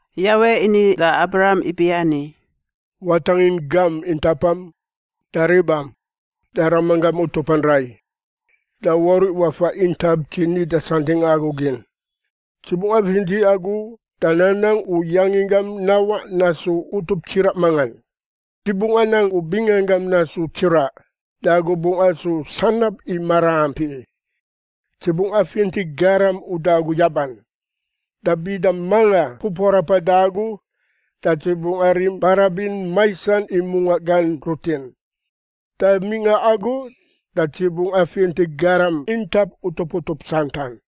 Yawe ini da Abram ibiani, “Watangin gam intapam, da ribam, da ramanggam utupan rai, da wauriꞌ wafa intap dzi nida santingꞌa agu gin. “Dzi bungꞌ afinti agu da nanang u yanginggam nawaꞌ nasu utup tsiraꞌ mangan. Dzi bungꞌ anang u binganggam nasu tsiraꞌ, da agu bungꞌ asu sanab i maraampi. Dzi bungꞌ afinti garam uda agu yaban, da bida manga pupuarapan da agu da dzi bungꞌ arim barabin maisan i mungaꞌ gan rutin. Da mingꞌa agu da dzi bungꞌ afinti garam intap utup utup santan.”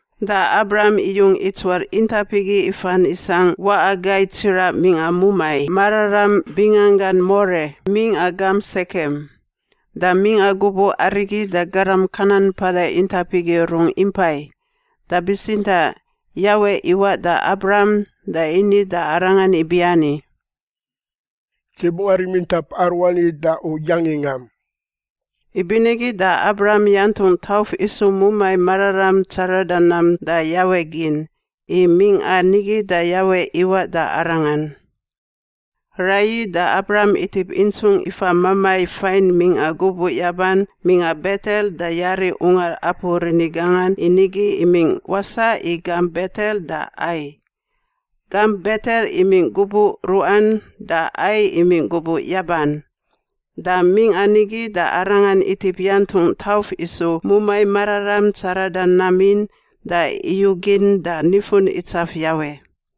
da Abram iyung itsuar intap igi ifan isangꞌ waꞌa gai tsiraꞌ mingꞌa mumai mararam binganggan More mingꞌa gamp Sekem. Da mingꞌa gubuꞌ arigi da garam Kanan mpada intap igi rungꞌ impai, da bitsintaꞌ Yawe iwaꞌ da Abram da ini da arangan ibiani, “Dzi bungꞌ arim intap aruani da u yanginggam.” Ibinigi da Abram yantungꞌ tauf isu mumai mararam tsarada nam da Yawe gin, i mingꞌa nigi da Yawe iwaꞌ da arangan. Raiyi da Abram itip intsungꞌ ifa mamai fain mingꞌa gubuꞌ yaban mingꞌa Betel da yari ungar apu rini gangan i nigi imingꞌ wasaꞌ i gamp Betel da Ai. Gamp Betel imingꞌ gubuꞌ ruꞌan da Ai imingꞌ gubuꞌ yaban. Da mingꞌa nigi da arangan itip yantungꞌ tauf isu mumai mararam tsarada nam in da iyugin da nifun itsaf Yawe.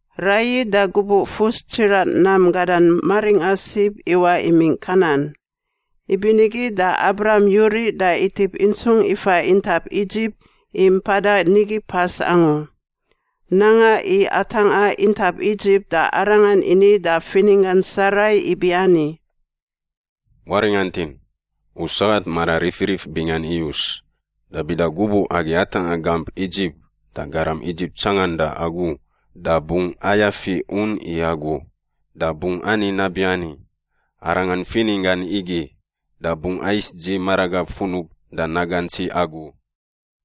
Raiyi da gubuꞌ fus tsiraꞌ nam gadan maringꞌa sib iwaꞌ imingꞌ Kanan. Ibinigi da Abram yuriꞌ da itip intsungꞌ ifa intap Idzip i mpadan nigi pas angu. Nanga i atangꞌa intap Idzip da arangan ini da fininggan Sarai ibiani, “Waringantin! U sagat mara rifirif bingan iyus. Da bida gubuꞌ agi atangꞌa gamp Idzip da garam Idzip tsanganda agu da bungꞌ ayafi un i agu, da bungꞌ ani nabiani, ‘Arangan fininggan igi,’ da bungꞌ ais dzi maragab funub da nagantsi agu.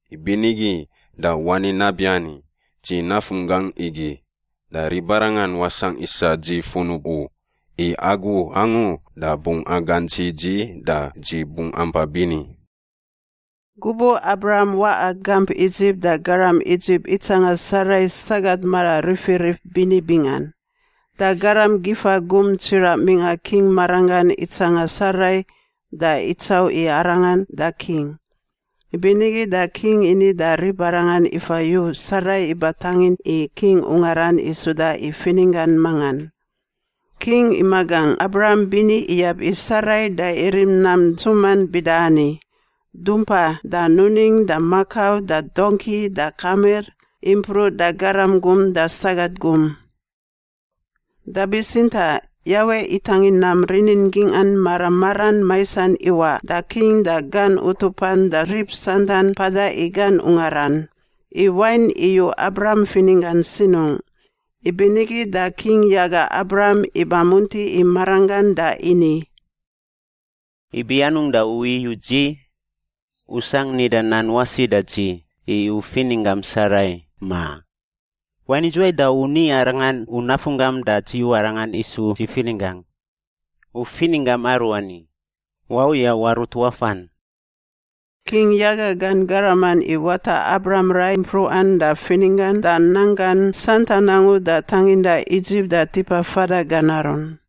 Ibinigi da wani nabiani, ‘Dzi nafunggangꞌ igi,’ da ribarangan wasangꞌ isa dzi funub u; i agu angu da bungꞌ agantsi dzi da dzi bungꞌ ampa bini.” Gubuꞌ Abram waꞌa gamp Idzip da garam Idzip itsanga Sarai sagat mara rifirif bini bingan. Da garam gifa gum tsiraꞌ mingꞌa king maranggan itsanga Sarai da itsauꞌ i arangan da king, ibinigi da king ini da ribarangan ifa yu Sarai iba tangin i king ungaran i suda i fininggan mangan. King imagangꞌ Abram bini iyab i Sarai da irim nam ntsuman bida ani: dumpa da nuning da makau da dongki da kamir impruꞌ da garam gum da sagat gum. Da bitsintaꞌ Yawe itangin nam rinin gingꞌan mara maran maisan iwaꞌ da king da gan utupan da rib santan mpada i gan ungaran, i wain iyu Abram fininggan sinungꞌ. Ibinigi da king yaga Abram iba munti i maranggan da ini, “Ibi anungꞌ da u iyuꞌ dzi? U sangꞌ nida nan wasi da dzi i u fininggam Sarai, ma? Wain idzuwai da u ni arangan u nafunggam da dzi yu arangan isu dzi fininggangꞌ? U fininggam aruani! Wau ya warut wafan!” King yaga gan garaman i wata Abram rai mpruꞌan da fininggan da nanggan santan angu da tanginda Idzip da tipa fada gan arun.